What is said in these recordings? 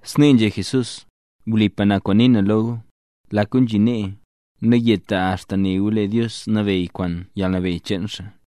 Snee nzhé Jesús: —Wlipa na kwaan nii na lo gu, lak gu nzhi nee, nayeta axta ne gu lee Dios nabeyy, kwaan yalnabeyy cheen xaa.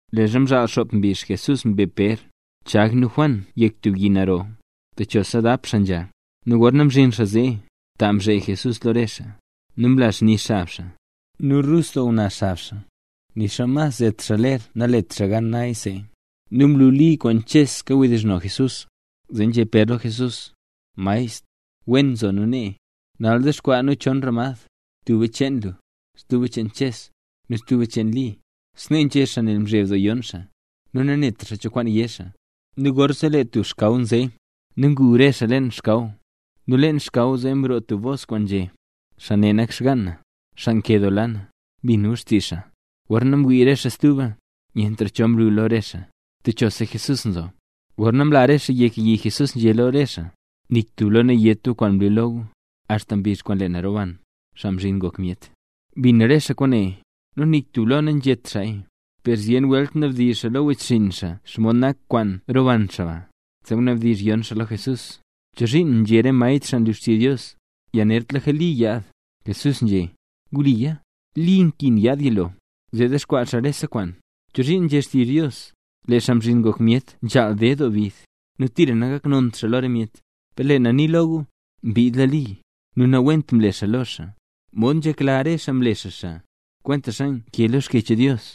Leezha mzhaal xop mbizh, Jesús mbe Pér, Chag nu Juan yek tub yi naro, techosa dap xaa nzha. Nu gorna mzhin xaa zee, ta mzhee Jesús lo re xaa. Nu mla xni xab xaa. Nu rus doo nguna xab xaa, nixa mas zet xaa ler nalet xaa gan naya see. Nu mlu Li kwaan Ches kawdizhno Jesús. Zee nzhé Pér lo Jesús: —Maestr, wen nzo nu nee. Nal dexkwaa nu chon ramad, tuba cheen lu, stuba cheen Ches, nu stuba cheen Li. Snee nzhé xaa nel mzheb doo yon xaa, nu nanetra xaa cho kwaan yé xaa. Nu gorzee lee tub xkaw nze, nu ngu re xaa leen xkaw zee. Nu leen xkaw zee mroo tub bos kwaan nzhé: —Xaa ne nak xgaan na, xaa nkedoola na. Bin gu xtizh xaa. Gorna mwii re xaa stuba, nyentra cho mlu lo re xaa, techosa Jesús nzo. Gorna mla re xaa yek yi Jesús nzhé lo re xaa: —Nik tub lo nayét gu kwaan mlu lo gu, axta zhin mbizh kwaan lee na roban, Xaa Mzhin Ngok Myet. Mbin re xaa kwaane, nu nik tub lo nanzhét xaaya. Per zyen welt nabdizh xaa lo wechxinn xaa xomod nak kwaan roban xaa ba. Zee mnabdizh yon xaa lo Jesús: —¿Chozhiin nzhé re maestr xaa nlu xtizh Dios, yanertlaka Li yaad? Jesús nzhé: —Wliya. Li nkin yaad yilo, zee dexkwaa xaa rese kwaan. ¿Chozhiin nzhé xtizh Dios: “Lee Xaa Mzhin Ngok Myet nzhaal ded doo bid, nu tira nangaknont xaa lo re myet”? Per lee na nii lo gu, mbiidla Li, nu nawent mle re xaa lo xaa, mod nzhekla re xaa mle xaa xaa, kwentaxa nkee lo Xkyech Dios.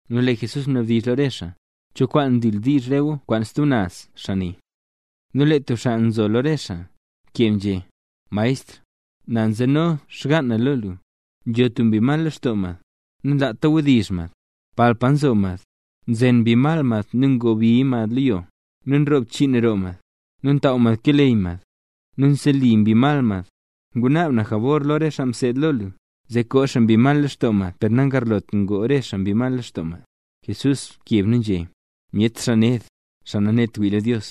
Nu lee Jesús mnabdizh lo re xaa: —¿Cho kwaan ndildiizh re gu kwaan stub naz xaa ne? Nu lee tub xaa nzo lo re xaa, mkeb nzhé: —Maestr, na nzeno xgaan na lo lu. Nzho tub mbi mal lextoo mad, nanlaata wdizh mad. Palpa nzo mad, nzen mbi mal mad nu ngobiya mad lo yo; nu nroo bchiin roo mad, nu ntaaw mad keleyy mad, nu nseli mbi mal mad. Ngunaab na jabor lo re xaa kaseed lo lu, zee koo xaa mbi mal lextoo mad per nangarlot ngoo re xaa mbi mal lextoo mad. Jesús mkeb nu nzhé: —Myet xaa ned, xaa nanet wii lo Dios.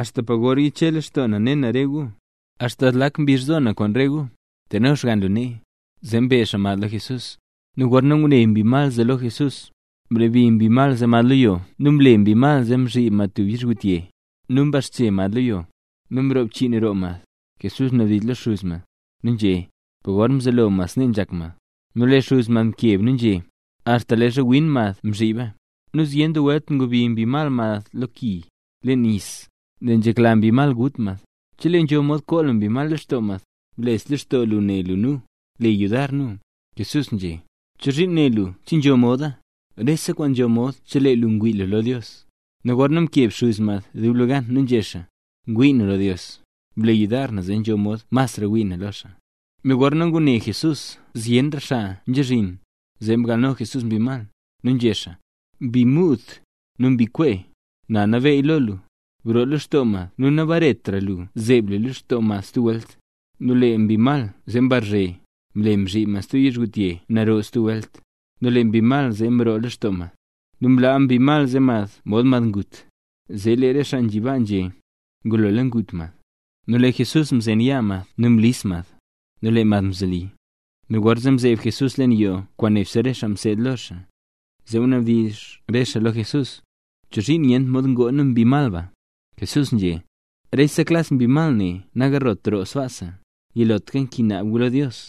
¿Axta pa gor yiche lextoo na ne na re gu? ¿Axta zlak mbizh nzhaal zo na lo re gu? Teno xgann lu nee. Zee mbe xaa mad lo Jesús. Nu gorna ngune mbi mal zee lo Jesús, mlebi mbi mal mad lo yo nu mle mbi mal mzhib mad tub yizhgutye. Nu mbaxche mad lo yo, nu mroo bchiin roo mad. Jesús mnabdizh lo xuz mad, nu nzhé: —¿Pok mzelo mad snee nzhak mad? Nu lee xuz mad mkeb nu nzhé: —Axta leezha win mad mzhiba. Nu zyen doo welt ngobi mbi mal mad lo ki, leen nis, nel nzhekla mbi mal gut mad. Cheleeya nzho mod koo lu mbi mal lextoo mad, bles lextoo lu ne lu nu, le yudar nu. Jesús nzhé: —¿Chozhiin né lu che nzho moda? Rese kwaan nzho mod chelee lu ngwii lu lo Dios. Nu gorzee mkeb xuz mad dublegan, nu nzhé xaa: —Ngwii na lo Dios, ble yudar na zee nzho mod masra wii na lo xaa. Nu gorna ngune Jesús zyenra xaa nzhazhin, zee mgalno Jesús mbi mal, nu nzhé xaa: —Mbi muud, nu mbi nkwee, na nabeey lo lu, broo lextoo mad nu nabaretra lu zeeb lu lextoo mad stub welt. Nu lee mbi mal zee mrazhe, mle mzhib mad stub yizhgutye naro stub welt, nu lee mbi mal zee mroo lextoo mad, nu mlaa mbi mal mad mod mad ngut. Zee lee re xaa nzhi baa nzhé: —Ngulola ngut mad. Nu lee Jesús mzen yaa mad nu mlis mad, nu lee mad mzoli. Nu gorzee mzeeb Jesús leen yoo kwaan nebse re xaa mseed lo xaa, zee mnabdizh re xaa lo Jesús: —¿Chozhiin nyent mod ngoo nu mbi mal ba? Jesús nzhé: —Rese klas mbi mal ne nagarlot roo sbaasa, yilotlaka nkin naab guya lo Dios.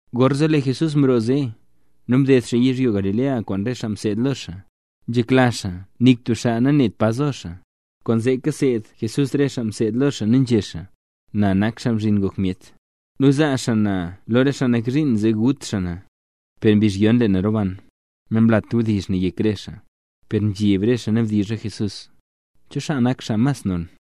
Gorzee lee Jesús mroo zee, nu mded xaa yizhyo Galilea kwaan re xaa mseed lo xaa. Nzhekla xaa nik tub xaa nanet pa zo xaa. Kwaanzee kaseed Jesús re xaa mseed lo xaa nu nzhé xaa: —Na nak Xaa Mzhin Ngok Myet. Nu zaa xaa na lo xaa nak zhiin zee gut xaa na, per mbizh yon lee na roban. Namlat wdizh ne yek re xaa, per nzheb re xaa nabdizh xaa lo Jesús. ¿Cho xaa nak mas non?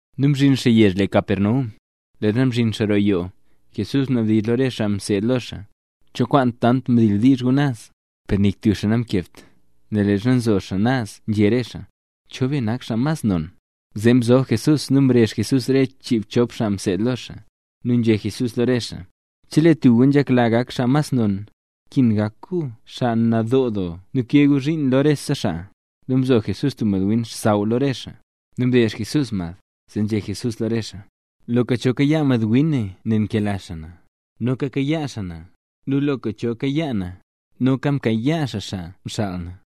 Nu mzhin xaa yezh le Capernaum. Leezha mzhin xaa roo yoo, Jesús mnabdizh lo re xaa mseed lo xaa: —¿Cho kwaan tant mdildiizh guya naz? Per nik tub xaa namkebt, nel leezha nzo re xaa naz nzhé re xaa: “¿Cho be nak xaa mas non?” Zee mzob Jesús nu mrezh Jesús re chiibchop xaa mseed lo xaa, nu nzhé Jesús lo re xaa: —Chelee tub gu nzhekla gak xaa mas non, nkin gak gu xaa nadoo doo nu kee gu zhiin lo rese xaa. Nu mzo Jesús tub madwin xsaww lo re xaa, nu mdeezh Jesús mad, zee nzhé Jesús lo re xaa: —Loka cho kayaa madwin ne nel nkela xaa na, noka mkayaa xaa na; nu loka cho kayaa na, noka mkayaa xaa xaa mxaal na.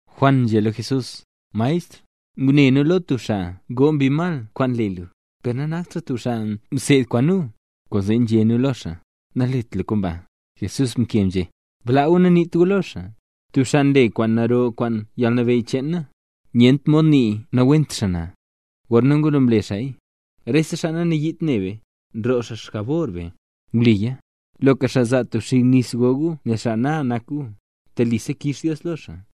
Juan nzhé lo Jesús: —Maestr, ngune nu lo tub xaa ngoo mbi mal kwaan le lu, per nanakt xaa tub xaa kaseed kwaan nu. Kwaanzee nzhé nu lo xaa: “Nalet lu kwaan ba”. Jesús mkeb nzhé: —Blaa gu nu naniit gu lo xaa. Tub xaa nle tub kwaan naro kwaan yalnabeyy cheen na, nyent mod nii nawent xaa na, gorna ngulo mle xaaya. Rese xaa nanayiit ne be, nroo xaa ba xjabor be. Wliya, loka xaa zaa tub xig nis go gu nel xaa na nak gu, telisa kix Dios lo xaa.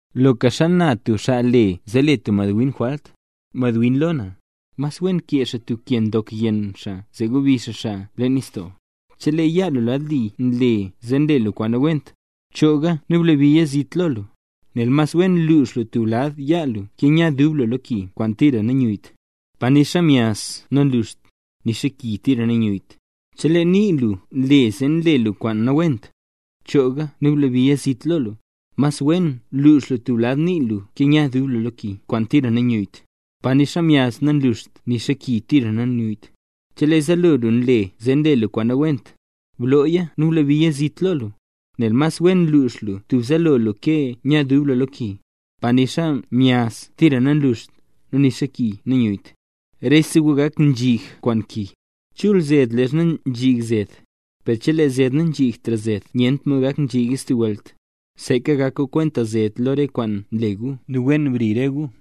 ’Loka xana tub xaa le zee le tub madwin jwalt, mad ngwii lo na, mas wen kee xaa tub ke ndok yenn xaa zee nu gobi xaa xaa leen nistoo. Chelee yaa lu lad li nle zee nle lu kwaan nawent, chooga nu blabiya zit lo lu, nel mas wen lux lu tub lad yaa lu ke nya dub lu lo ki kwaan tira nanyuyyt, pa nixa myaz nanluxt, nixa ki tira nanyuyyt. Chelee nii lu nle zee nle lu kwaan nawent, chooga nu blabiya zit lo lu, nel mas wen lux lu tub lad nii lu ke nya dub lu lo ki kwaan tira nanyuyyt, pa nixa myaz nanluxt nixa ki tira nanyuyyt. Chelee zaalo lu nle zee nle lu kwaan nawent, blooya nu blabiya zit lo lu, nel mas wen lux lu tub zaalo lu ke nya dub lu lo ki, pa nixa myaz tira nanluxt, nu nixa ki nanyuyyt. ’Rese gu gak nzhig kwaan ki. Chul zed leezha nzhig zed, per chelee zed nanzhigtra zed nyentra mod gak nzhiga stub welt. Seeka gak gu kwenta zed lo rese kwaan nle gu, nu wen bri re gu.